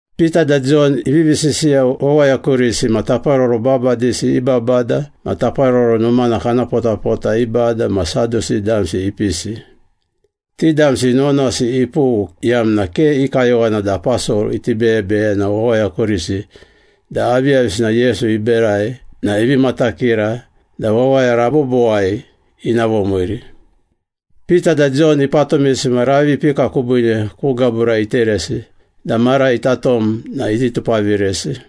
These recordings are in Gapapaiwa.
Pita da Jon ivivi sisiya wawaya kurisi na taparoro babadisi i babada ma Taparoro Numana kana potapota i bada ma Sadusi damsi ipisi. Ti damsi nuwanuwasi ipughu iyamna ke i kayowana da aposol iti beyebeyena wawaya kurisi da aviyavisina Yesu iberai na ivi matakira da wawaya rabobowai ina vomiiri. Pita da Jon ipatumisi ma ravi ipika kubiine ku gabura iteresi da mara ita tom na iti tupaviresi.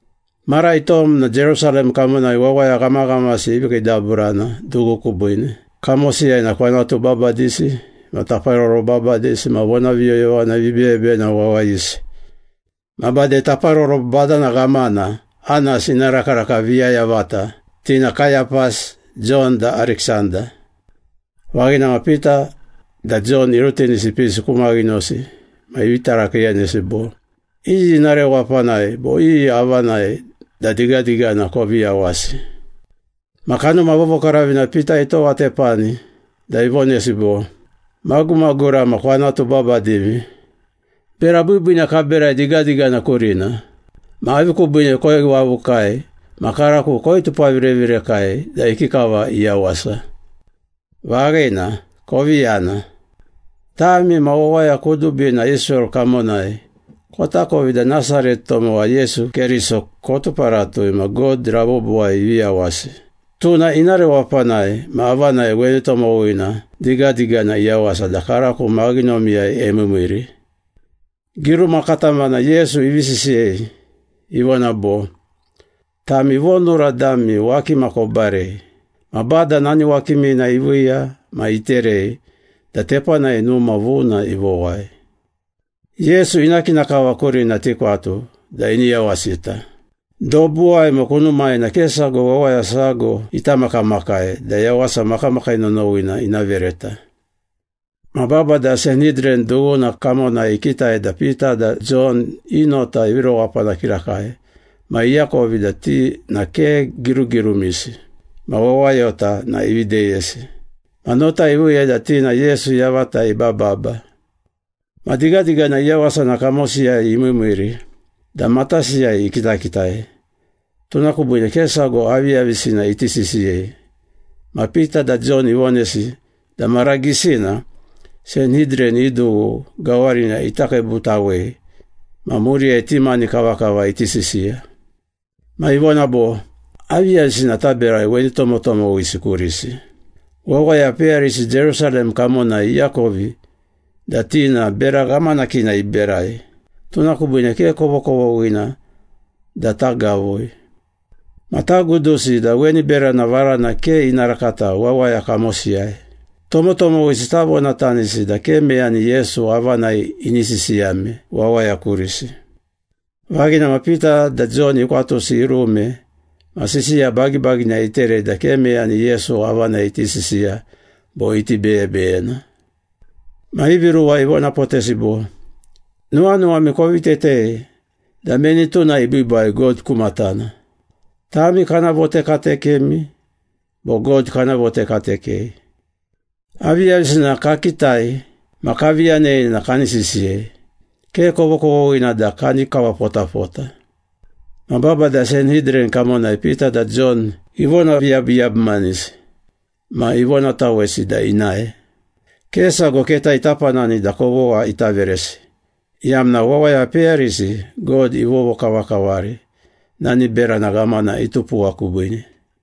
Mara itom na Jerusalem kamonai wawaya ghamaghamasi ivi kiidaburana dughu kubiine. Kamosiyai na kwanatu babadisi ma taparoro babadisi ma vonaviyoyovana vibeyebeyena wawayisi, ma bade taparoro badana ghamana Anas ina rakaraka viya yavata, ti na Kayapas, Jon da Ariksanda. Vaghina ma Pita da Jon irutinisi ipisi ku maghinosi ma ivi tarakiiyanesi bo, “Iyi ina rewapanai bo iyi avanai da digadigana kovi yawasi?” Ma Kanuma Vovokaravina Pita itowatepani da ivonesi bo, “Magumagura ma kwanatu babadimi, bera biibiina kaberai digadigana kurina. Ma avi kubiine koiwavukai ma karako koitupavirevirekai da ikikava iyawasa? Vaghina, kovi yana. Tami ma wawaya kudubina Israel kamonai kotakovi da Nasaret tomowa Yesu Keriso kotuparatui ma God rabobowai ivi yawasi. Tuna ina rewapanai ma avanai weni tomowina digadigana iyawasa da karako maghinomiyai emiimiiri. Giruma katamana Yesu ivi sisiyei, ivona bo, ‘Tami vonura dami wakima kobarei, Ma Bada nani wakimina iviiya ma iterei da tepanai numa vuna ivowai.’” “Yesu ina kina kava kurina tikwatu da ini yawasita. Dobuwai ma kunumai na ke sago wawaya sago ita makamakai da yawasa makamakii nonowina ina vereta.” Ma babada Sanhidran dughuna kamonai ikitai da Pita da Jon i nota ivi rewapana kirakai ma iakovi da ti na ke girugirumisi ma wawayota na ivi deyesi. Ma nota iviiya da ti na Yesu yavata ibababa. Ma digadigana iyawasa na kamosiyai imiimiiri da matasiyai ikitakitai, tuna kubiine ke sago aviyavisina iti sisiyei ma Pita da Jon ivonesi da mara gisina Sanhidran i dughu gawarina ita kiibutawei ma muriyai ti mani kavakava iti sisiya. Ma ivona bo, “Aviyavisina taberai weni tomotomowisi kurisi? Wawaya peyarisi Jerusalem kamonai iakovi da ti na bera ghamanakina iberai, tuna kubiine ke kovokovoghina da tagavui. Ma tagudusi da weni berana varana ke ina rakata wawaya kamosiyai. Tomotomowisi tavonatanisi da ke meyani Yesu avanai ini sisiyame wawaya kurisi.” Vaghina ma Pita da Jon ikwatusi irume ma sisiya bagibagina iterei da ke meyani Yesu avanai iti sisiya bo iti beyebeyena. Ma ivi ruwa ivonapotesi bo, “Nuwanuwami kovi tetei da meni tuna ibiibai God ku matana. Tami kana votekatekemi bo God kana votekatekei? Aviyavisina kakitai ma kavi yanei na kani sisiyei, ke kovokovoghina da kani kawapotapota.” Ma babada Sanhidran kamonai Pita da Jon ivonaviyabuyabumanisi ma ivonatawesi da inae. Ke sago keta ita panani da kovogha ita veresi, iyamna wawaya peyarisi God ivovokavakavari nani berana ghamana itupuwa kubiine.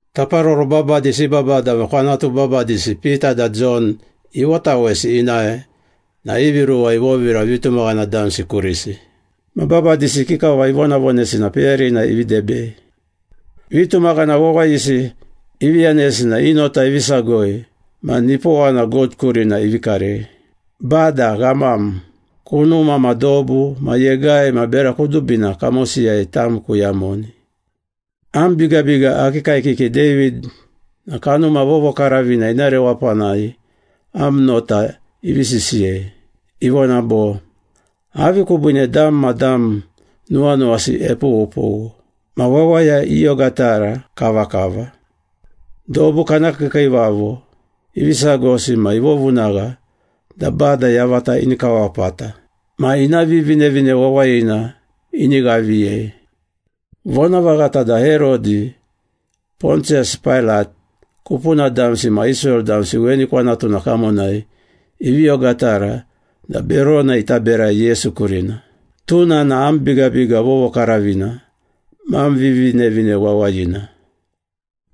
Taparoro babadisi i babada ma kwanatu babadisi Pita da Jon ivotawesi inae na ivi ruwa ivovira vitumaghana damsi kurisi. Ma babadisi ikikava ivonavonesi na peyarina ivi debei. Vitumaghana wawayisi ivi yanesi na i nota ivi sagoi ma nipowana God kurina ivi karei, “Bada Ghamam, kunuma ma dobu ma yegai ma bera kudubina kamosiyai tam kuyamoni. Am bigabiga akii kaekiki David na Kanuma Vovokaravina ina rewapanai am nota ivi sisiyei. Ivona bo, ‘Avi kubiine dam ma dam nuwanuwasi epughupughu, ma wawaya iogatara kavakava? Dobu kana kiikiivavo ivi sagosi ma ivovunagha da Bada yavata ini kawapata ma ina Vivinevine Wawayina ini ghaviyei.’” “Vonavaghata da Herodi, Pontiyas Pailat, kupuna damsi ma Israel damsi weni kwanatuna kamonai ivi ogatara da berona ita berai Yesu kurina. Tuna na am bigabiga vovokaravina ma am Vivinevine Wawayina.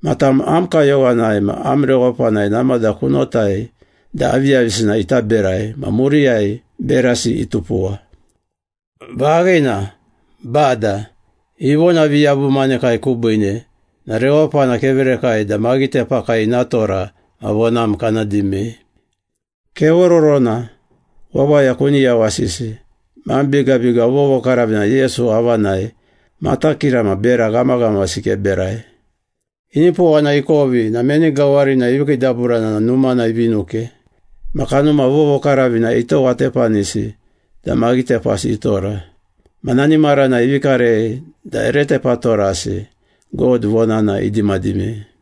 Ma tam am kayowanai ma am rewapanai namada kunotai da aviyavisina ita berai ma muriyai berasi itupuwa. Vaghina, Bada, ivonaviyabumanekai kubiine na rewapana keverakai da maghitepakai ina tora ma vonam kana dimei. Kevororona, wawaya kuni yawasisi ma am bigabiga vovokaravina Yesu avanai matakira ma bera ghamaghamasi keberai.” Inipowana ikovi na meni gawarinai ivi kiidaburana na numana ivi nuke. Ma Kanuma Vovokaravina itowatepanisi da maghitepasi itora. Ma nani maranai ivi karei da ere tepatorasi God vonana idimadimei.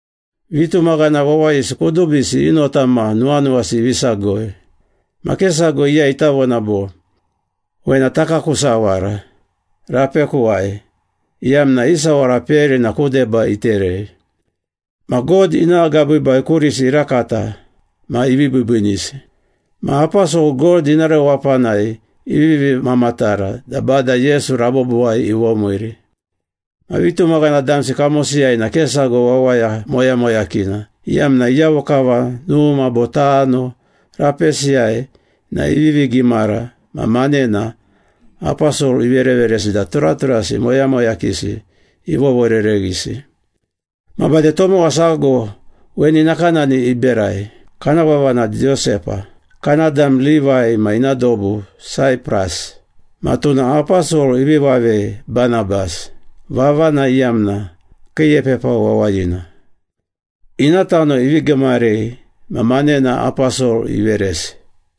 Vitumaghana wawayisi kudubisi i nota ma nuwanuwasi ivi sagoi. Ma ke sago iyai ita vona bo, “Wena taku aku sawara, rapekuwai,” iyamna i sawara peyarina ku deba iterei. Ma God ina agabiibai kurisi irakata ma ivi biibiinisi. Ma aposol God ina rewapanai ivivi mamatara da Bada Yesu rabobowai ivomiiri. Ma vitumaghana damsi kamosiyai na ke sago wawaya moyamoyakina, iyamna iyavo kava numa bo tano rapesiyai na ivivi gimara ma manena aposol ivereveresi da turaturasi moyamoyakisi ivovorereghisi. Ma bade tomowa sago weni nakanani iberai, kana vava na Josepa, kana dam Livai ma ina dobu Saipras, ma tuna aposol ivi vavei Banabas, vavana iyamna ‘kiiepepa wawayina.’ Ina tano ivi gimarei ma manena aposol iveresi.